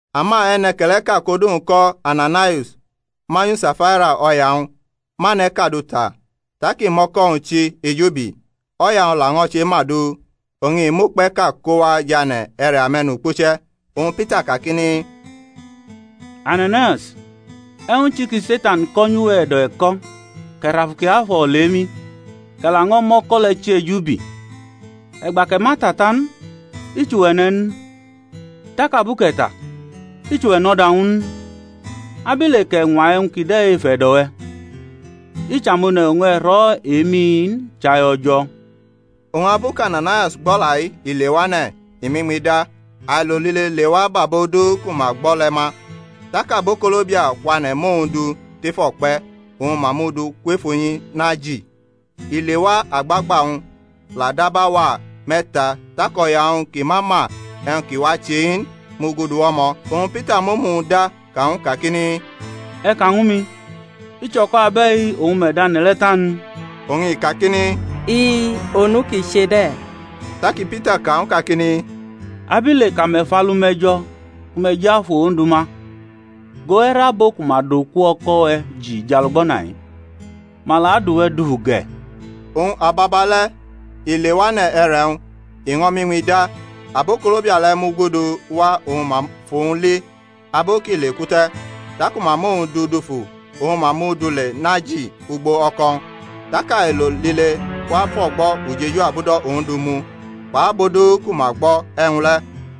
Ama e̩ne̩ke̩le̩ʼka kʼodu-wñ ko̩ Ananaius, manyu Safaira o̩ya-wñ, mʼane̩ʼka du ta, tak i mʼo̩ko̩-wñ chi ejubi, o̩ya-wñ laño̩ chema du, oñ i mʼukpe̩ʼka ko wa jʼane̩ e̩re̩ ame̩nukpuche̩. Oñ Pita kakini, Ananaius, e̩wñ chi ki Se̩tan ko nyʼuwe̩ e̩do̩ e̩ko̩, kʼe̩ rʼAfu Kiafo̩ olemi? kʼe̩ laño̩ mʼo̩ko̩ le̩ chi ejubi? E̩gba kʼe̩ ma ta ta n, i chʼuwe̩ ne̩ n? tak abu kʼe̩ ta, ichʼuwe̩ nʼo̩da-wñ n? Abile kʼe̩ ñwa e̩wñ kide̩ ef e̩do̩-we̩? I chʼamone̩ oñ e̩ rʼo̩ emi-i n, chai O̩jo̩. Oñ abu kʼAnanaius gbʼo̩la-i, i lewane̩, i mʼiñmi da. Ailo lile la lewa bʼabo du ku ma gbo̩ le̩ ma. Tak abokolobia kwane̩ mʼowñ du tʼef o̩kpe̩, oñ ma mʼu du kwef unyi naji. I lewa agbagba-wñ la dab auwa me̩ta tak o̩ya-wñ ki ma ma e̩wñ ki wa che-i n mugudu wʼo̩mo̩. Oñ Pita mʼomu-wñ da ka ñw u kakini, E̩ ka ñwu mi, i chʼo̩ko̩ abe̩i oñ me̩ dʼane̩ le̩ ta n? Oñ i kakini, li, onu ki che de̩. Taki Pita ka ñw u kakini, Abile kʼame̩ fʼalu-me̩ jo̩ ku me̩ jʼAfu Ondu ma? Go, e̩re̩ abo ku ma dʼoku o̩ko̩-we̩ ji jʼalugbana-i, ma la adʼuwe̩ dufu ge̩. Oñ ababale̩ i lewane̩ e̩re̩-wñ, i ño̩ mʼiñmi da: abokolobia le̩ mugudu wa oñ ma fʼowñ li abu kʼi leku te̩. Taku ma mʼowñ du dufu oñ ma mʼu du le naji ugbo o̩ko̩-wñ. Tak ailo lile wa fʼo̩gbo̩ ujeju abudo̩ Ondu mu, kpʼabo du ku ma gbo̩ e̩wñ le̩.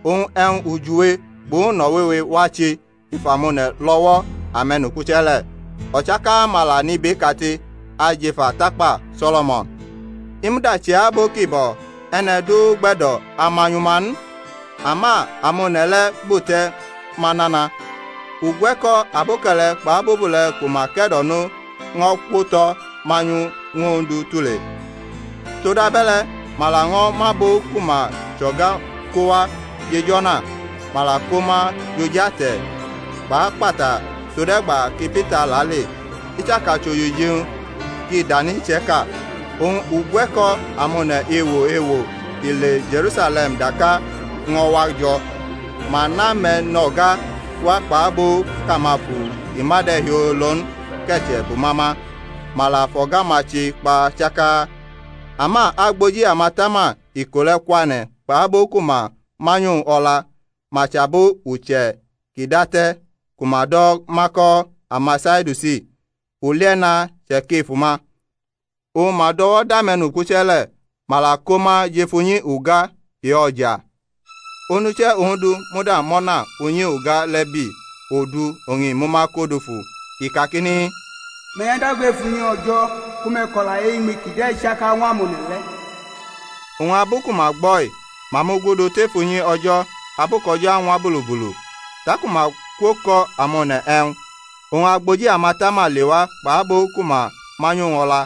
Oñ e̩wñ ujiwe kpʼuno̩ wewe wa che ef amone̩ lʼo̩wo̩ ame̩nukpuche̩ le̩. O̩chaka-ma la nʼibeʼkate ajʼef atakpa So̩lo̩mo̩n. I muda chʼe-abo ki bo̩ e̩ne̩ du gbe̩do̩ amanyʼuma n: ama amone̩ le̩ bute̩ ma nana. Ugwe̩ko̩ aboke̩le̩ kpʼabobule̩ ku ma ke̩do̩no ño̩ kwotʼo̩ manyu ñw Ondu tule: todabe̩le̩ ma laño̩ mʼabo ku ma chʼo̩ga ko wa jʼej o̩na, ma la ko ma jʼo̩j ate̩ kpʼakpata tode̩gba ki Pita lale, i chaka chʼojiji-wñ ki danʼiche̩ka. Oñ ugwe̩ko̩ amone̩ ewo ewo ki le Je̩rusale̩m daka ño̩ wa jo̩. Ma nʼame̩no̩ga wa kpʼabo kʼamafu ki ma de̩ hiolo n ke̩che̩ bʼuma ma; ma la fʼo̩ga-ma che kpa chaka. Ama agboji amatama iko le̩ kwane̩ kpʼabo ku ma manyʼowñ o̩la (ma chʼabo uche̩ ki date̩ ku ma do̩ ma ko̩ amaSadiusi) ulie̩na che̩kʼef uma. Oñ ma dʼo̩wo̩ dʼame̩nukpuche̩ le̩, ma la ko ma jʼef unyi uga e-o̩ja. Onuche̩ Ondu muda mʼo̩na unyi uga le̩ bi odu oñ i mʼuma ko dufu, i kakini, Me̩ nyʼadago ef unyi O̩jo̩ ku me̩ kʼo̩la e-Iñmi kide̩ chaka ñw amone̩ le̩. Oñ abu ku ma gbo̩-i ma mugudu tef unyi O̩jo̩ abu kʼo̩jo̩ añwa bulubulu, taku ma kwokamone̩ e̩wñ. Oñ agboji amatama lewa kpʼabo ku ma manyʼowñ o̩la,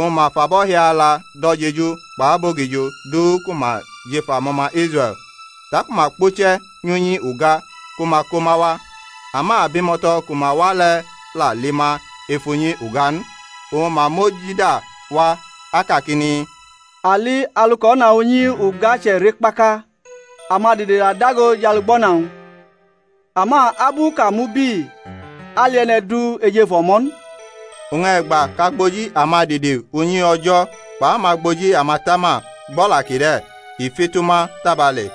oñ ma fʼabo̩hiala do̩ jeju kpʼabogijo du ku ma jʼef amo̩ma Israe̩l. Taku ma kpuche̩ nyʼunyi uga ku ma ko ma wa. Ama abimo̩to̩ ku ma wa le̩ la li ma ef unyi uga n: oñ ma mojida wa, akakini, A li alu kʼo̩na unyi uga che̩re kpaka, amadide la dago jʼalugbana-wñ; ama abu kʼa mubi ali e̩ne̩ du ejefu o̩mo̩ n. Oñ e̩gba kʼagboji amadide unyi O̩jo̩ kpʼamagboji amatama gbʼo̩la kide̩ i fitu ma tabale,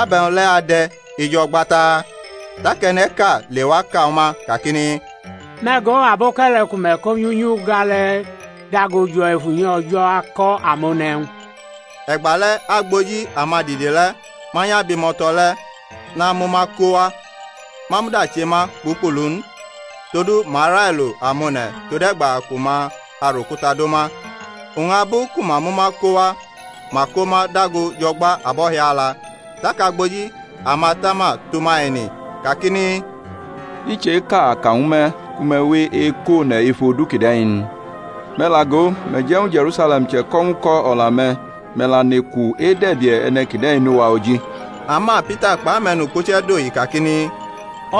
ab e̩wñ le̩ ade̩ ejo̩gba taa? Tak e̩ne̩ʼka lewa ka ñw ma kakini, Me̩ go, aboke̩le̩ ku me̩ ko nyʼunyi uga le̩ dago jo̩ ef unyi O̩jo̩ ako̩ amone̩ e̩wñ. E̩gbale̩ agboji amadide le̩ manyʼabimo̩to̩ le̩ namʼuma ko wa, ma muda che ma kpukpulu n, todu ma railo amone̩ tode̩gba ku ma arʼokuta do ma. Oñ abu ku ma mʼuma ko wa ma ko ma dago jʼo̩gba abo̩hiala. Tak agboji amatama tʼuma ene, kakini, I cheka a ka ñw me̩ ku me̩ we ekʼone̩ ef odu kide̩ n? Me̩ la go, me̩ je̩ ñw Je̩rusale̩m che̩ko̩ ñw uko̩ o̩la-me̩, me̩ la neku edʼe̩bie̩ e̩ne̩ kide̩ nʼuwa oji. Ama Pita kpʼame̩nukpuche̩ dohi kakini,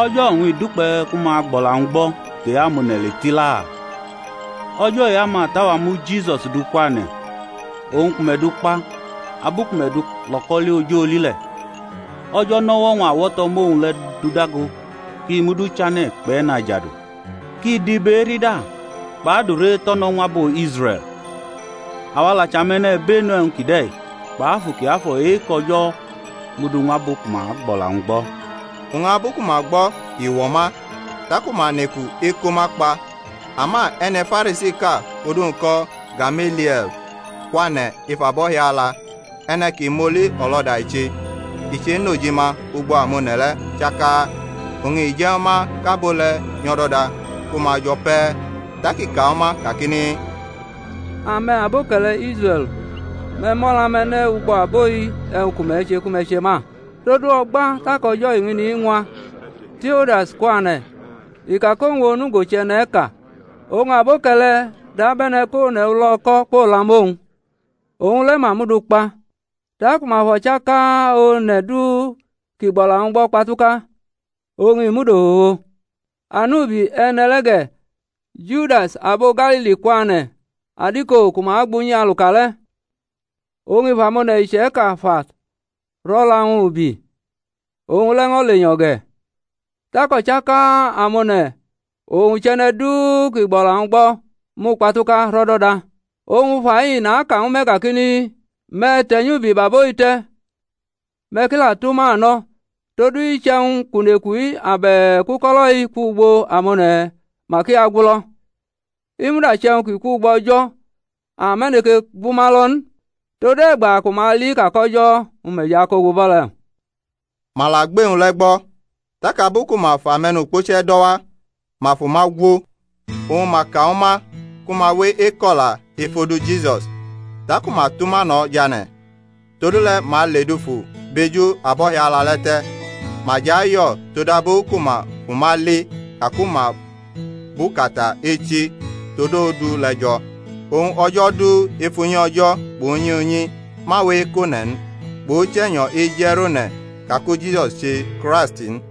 O̩jo̩ oñ i dukpe̩ ku ma agbʼo̩la-wñ gbo̩ tʼe-amone̩ le tila. O̩jo̩ e-amata-wa mu Jisus du kwane̩, owñ ku me̩ du kpa abu ku me̩ dʼu lo̩ko̩li oj oli le̩. O̩jo̩ nʼo̩wo̩-wñ awo̩to̩ mʼowñ le̩ dudago kʼi mud Uchane̩ kpʼE̩najadu, kʼi dʼibe enda kpʼadure eto̩no̩ ñw abo Israe̩l. Awa la chʼame̩mbenu e̩wñ kide̩: kpʼAfu Kiafo̩ e-kʼO̩jo̩ mudu ñw abo ku ma gbʼo̩la-wñ gbo̩. Oñ abu ku ma gbo̩ i wo̩ ma, taku ma neku eko ma kpa. Ama e̩ne̩ Farisiʼka kʼodu-wñ ko̩ Gamelie̩l kwane̩ ef abo̩hiala, e̩ne̩ ki mʼoli o̩lo̩da i che, i chenʼojima ugbo amone̩ le̩ chaka, oñ i je̩ ñw ma kʼabo le̩ nyʼo̩doda ku ma jo̩ pe̩. Tak i ka ñw ma kakini, Ame̩, aboke̩le̩ Israe̩l, me̩ mʼo̩la-me̩ ne̩ ugbo abo-i, e̩wñ ku me̩ che ku me̩ che ma. Todu o̩gba tak o̩jo̩ eñini ñwa Teudas kwane̩, i ka kʼowñ onugo chʼe̩ne̩ʼka; oñ aboke̩le̩ dabe̩ne̩ kʼone̩ ulo̩ko̩ kwolamʼowñ; owñ le̩ ma mʼu du kpa; taku ma fʼo̩chaka one̩ du kʼi gbʼo̩la-wñ gbo̩ kpatuka, oñ i mud ofofo. Anubi e̩ne̩ le̩ ge̩, Judas, abo Galili kwane̩ adiko ku ma gbʼunyi aluka le̩, oñ i fʼamone̩ iche̩ka fa rʼo̩la-wñ ubi: owñ le̩ ño̩ lenyo̩ ge̩; tak o̩chaka amone̩, owñ chʼe̩ne̩ du ki gbʼo̩la-wñ gbo̩, mukpatuka rʼo̩do̩da. Oñ fai naka ñw me̩ kakini, Me̩ te̩ nyʼubi bʼabo-i te̩, me̩ ki la tʼuma no̩. Todu iche̩wñ kʼuneku-i abe̩k uko̩lo̩-i kwʼugbo amone̩, mak i agulo: i muda che̩wñ kʼi kwʼugbo O̩jo̩ ame̩ aneke gʼuma lo̩ n. Tode̩gba ku ma ali ka kʼO̩jo̩ me̩ jʼukogu bʼo̩ le̩. Ma la gbʼe-wñ le̩ gbo̩. Tak abu ku ma fʼame̩nukpuche̩ do̩ wa, ma fʼuma gwo, oñ ma ka ñw ma ku ma we eko̩la ef odu Jisus. Taku ma tʼuma no̩ jane̩. Todule̩ ma le dufu bʼeju abo̩hiala le̩ te̩, ma jʼayo̩ todabu ku ma fʼuma li ka ku ma bʼukata echi tod odu le̩ jo̩. Oñ o̩jo̩ du, ef unyi O̩jo̩ kpʼunyi unyi ma we ekʼone̩ n, kpʼUche̩nyo̩ eje̩ rʼone̩ ka ku Jisus che Kraist n.